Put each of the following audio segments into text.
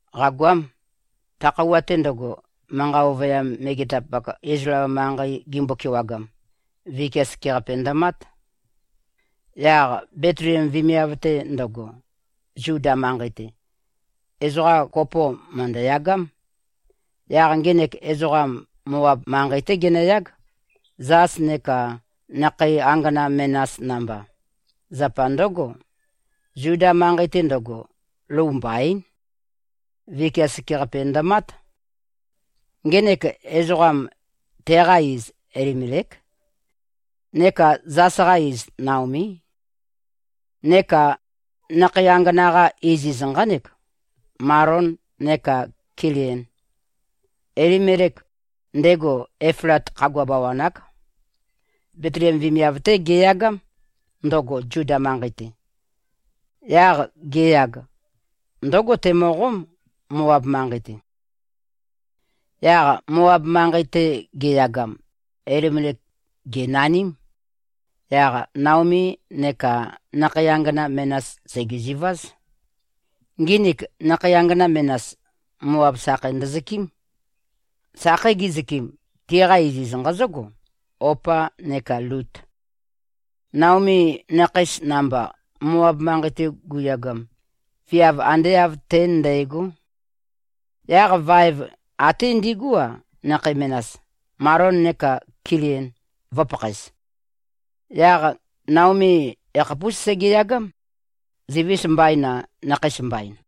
Qàgoám. Ta khøuwa-te ndøgo, manqa ovøyam megetapak Izlael manqei gimbo-kewagam, vikia sekeqape ndømát. Yaq Betliem vemiav-te ndøgo, Zuda manqei-te, ezoqa kopo mø̀ndøyagám. Yaq ngenek ezoqam Moab manqei-té genøyág, zas neka nakhei angana menas namba. Zapa ndǿgo, Zuda manqei-te ndøgo, lou mbaín. Vikia sekeqape ndømát. Ngenek ezoqam, teqa iz Elimelék. Neka zas-qa iz Naomí. Neka nakhei angana-qa iziz nqánek, Malon neka Kilion. Elimelek, ndego Eflat khagua bawan-ák. Betliem vemiav-té geyagám, ndøgo Zuda manqei-te. Yaq geyag, ndǿgo temøqóm, Moab manqei-te. Yaq Moab manqei-te giyagam, Elimelek gènaním. Yaq Naomi neka nakhei angana menas sègezuváz. Nginik nakhei angana menas Moab sakheis ndøzøkɨ́m. Sakhei gizøkɨm, tiqa iziz nqazǿgo, Opa neka Lut. Naomi nakheis namba, Moab manqei-te guyagam, viav ande āv tén ndægó. Yaq vaev até ndigú-a, nakhei menas, Malon neka Kilion, vø̄pakhaez. Yaq Naomi yakhapús segeyagám. Zivis mbaín-a, nakheis mbain.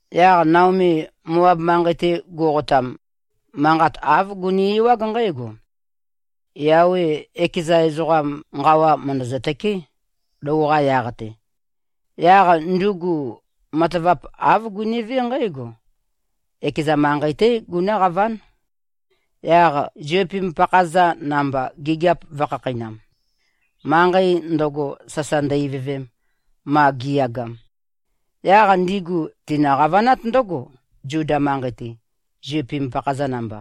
Yaq Naomi Moab manqei-te guqotam, manqat āv guni-ewág nqǽgo, Yawe ekeza ezoqam nqawa mø̀ndøzø-tøké, lou-qa yaq-te. Yaq ndugu matavap āv gunivé nqǽgo. Ekeza manqei-té gunǿqaván. Yaq ziupim-pakha-za namba gigiap vø̄khakheinam, manqei ndøgo sasa ndø-ivøvem, ma gi꞉yagam. Yaq ndigu tinø-qavanát ndǿgo, Zuda manqei-te, ziupim-pakha-za namba.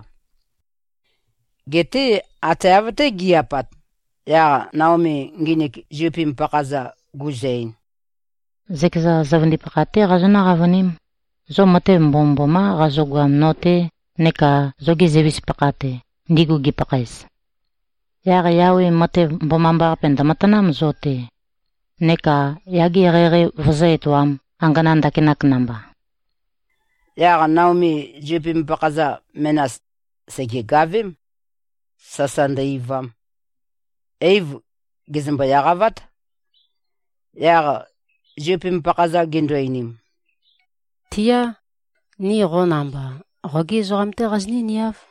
Geté ate av-té gi꞉-apat, yaq Naomi nginik ziupim-pakha-za guzø-ein, “Zøkeza zøvøndipakha-té qazonǿ-qavøním. Zo matev mbomømbomá qazogoam no-te neka zogi zøivis-pakha-te, ndigu gipakhaez. Yaq Yawe matev mbomambaqape ndø̀matanám zo-te, neka yage eqeieqei vøzǿ-etoām, angana ndakinak namba.” Yaq Naomi ziupim-pakha-za menas sègegavém, sasa ndø-eivam. Eiv gèzømbo-eqavát. Yaq ziupim-pakha-za gindu-einim, “Tiá. Ni qo namba, qogí ezoqam-té qazinǿ-niáv.”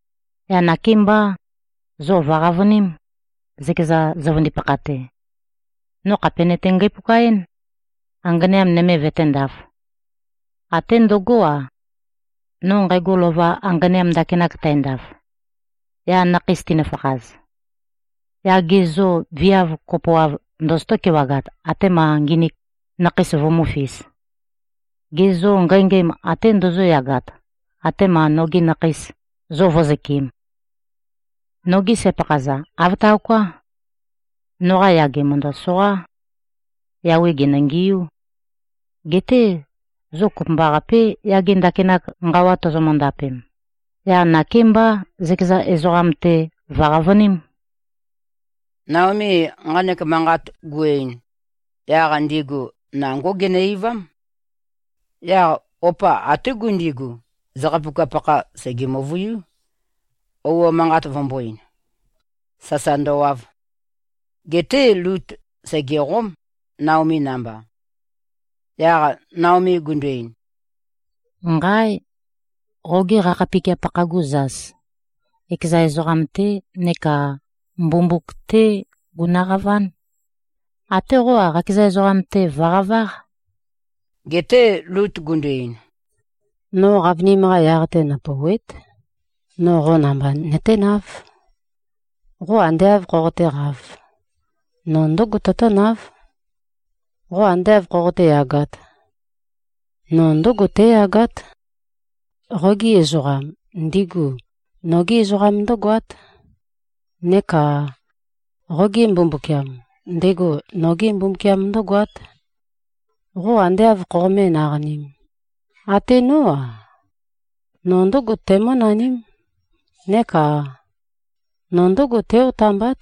Yaq nakémbá. Zo vø̀qavøním, zøkeza zøvøndipakha-te. No khàpe nøte-ngæpuka-én, anganeam nøme vøténdāf. Até ndøgó-a, no nqægo lova anganeam ndakinak tændaf, yaq nakheis tinøfakhaz, yaq ge zô, viav kopoav ndozotó-kewagat atema nginik nakheis vumúfīs? Ge zô, ngængæm até ndozóyagat, atema nogi nakheis zo vǿzøkɨ̄m? Nogí sæ-pakha-za. Āv taoká. Noqa yage mø̀ndøsoqá. Yawe gènøngiú. Geté zo kopømbaqapé, yage ndakinak nqawa tozomø-ndapem. Yaq nakémbá, zøkeza ezoqam-te vø̀qavøním.” Naomi nqanek manqat gu-ein, yaq ndigu nangó ginø-eivám. Yaq Opa até gundigu, zakhapuka-pakha sège-møvøiú, ouo manqat vømbō-ein, sasa ndøwav. Geté Lut sègeqóm, Naomi namba. Yaq Naomi gundu-ein, “Nqáe! Qoge qakhapikia-pakha-gu zas, ekeza ezoqam-té neka mbumbuk-té gunøqaván. Até qó-a, qakeza ezoqam-te vø̀qaváq.” Geté Lut gundu-ein, “No qavønim-qa yaq-te nøpòuwe᷄t. No qó namba nøténáv. Qo ande āv khoqotéqāv, no ndǿgo tøtǿnáv. Qo ande āv khoqoté-yagāt, no ndǿgo tǽyagát. Qogi ezoqam, ndigu nogí ezoqam ndǿgoát. Neka qoge Mbumbukiam, ndego nogé Mbumbukiam ndǿgoát. Qo ande āv khoqomé-naqanīm, até nó-a, no ndǿgo tæmǿnaním. Neka no ndǿgo tǽ-otambát.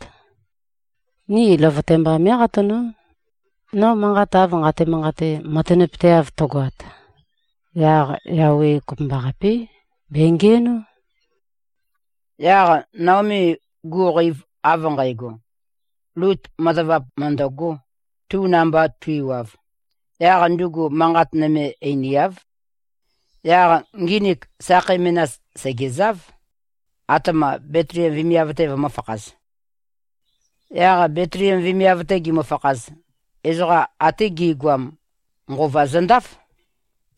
Ni løvøte mbá mé꞉qatanó. No manqat av nqate-manqate, matanapøteav tøgoat, yaq Yawe kopømbaqapé. Bèngiænó.” Yaq Naomi guqeiv av nqægo, Lut matavap mø̀ndøgō, tu namba tu-iwav, yaq ndugu manqat nøme einiáv. Yaq nginik sakhei menas sègezáv, atema Betliem vemiav-te vømø̄fakhaz. Yaq Betliem vemiav-te gimøfakhaz, ezoqa ate gi꞉goam nqova zøndáf.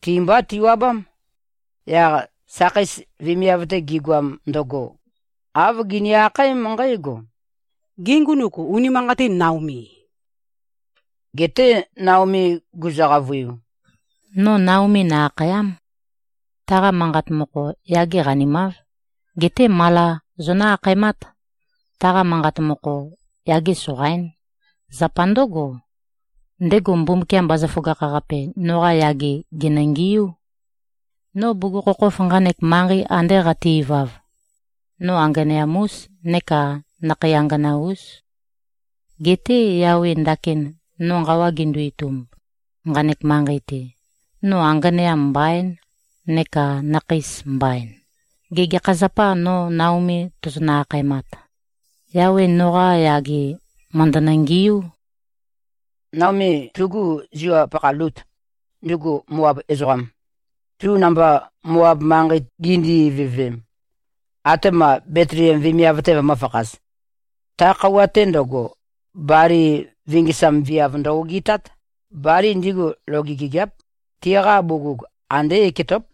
Ti-mbá tiwabám. Yaq sakheis vemiav-te gigoam ndøgo, āv gini-akhaém nqǽgo, “Gê, ngunuk unimanqatîn, Naomì?” Geté Naomi guzø-qavøiu, “No Naomi nø-akhàya᷄m. Taqa manqa mokho, ‘Yage qanimāv’. Geté Mala zonǿ-akhaemát. Taqa manqa mokho, ‘Yage soqaín’. Zapa ndǿgo, ndego Mbumbukiam Bazaføgakh-Qape noqa yage gènøngiú. No bugukhokhof nqanek manqei ande qate-ivav, no anganeam-ús neka nakhei angana-ús. Geté Yawe ndakin no nqawa gendo-itumb, nqanek manqei-te, no anganeam mbaín, neka nakheis mbain. Gê, gekha zapâ no Naomi tozonø-akhaemat? Yawe noqa yage mø̀ndønø-ngiú.” Naomi tugu ziwap-pakha Lut, ndugu Moab ezoqam, tu namba Moab manqei gindi-ivøvem, atema Betliem vemiav-te vømø̄fakhaz, ta khøuwa-te ndøgo, bali vingisam viav ndø-ogitát. (Bali ndigu loge gigiáp. Tiqa bugug andé eketóp.)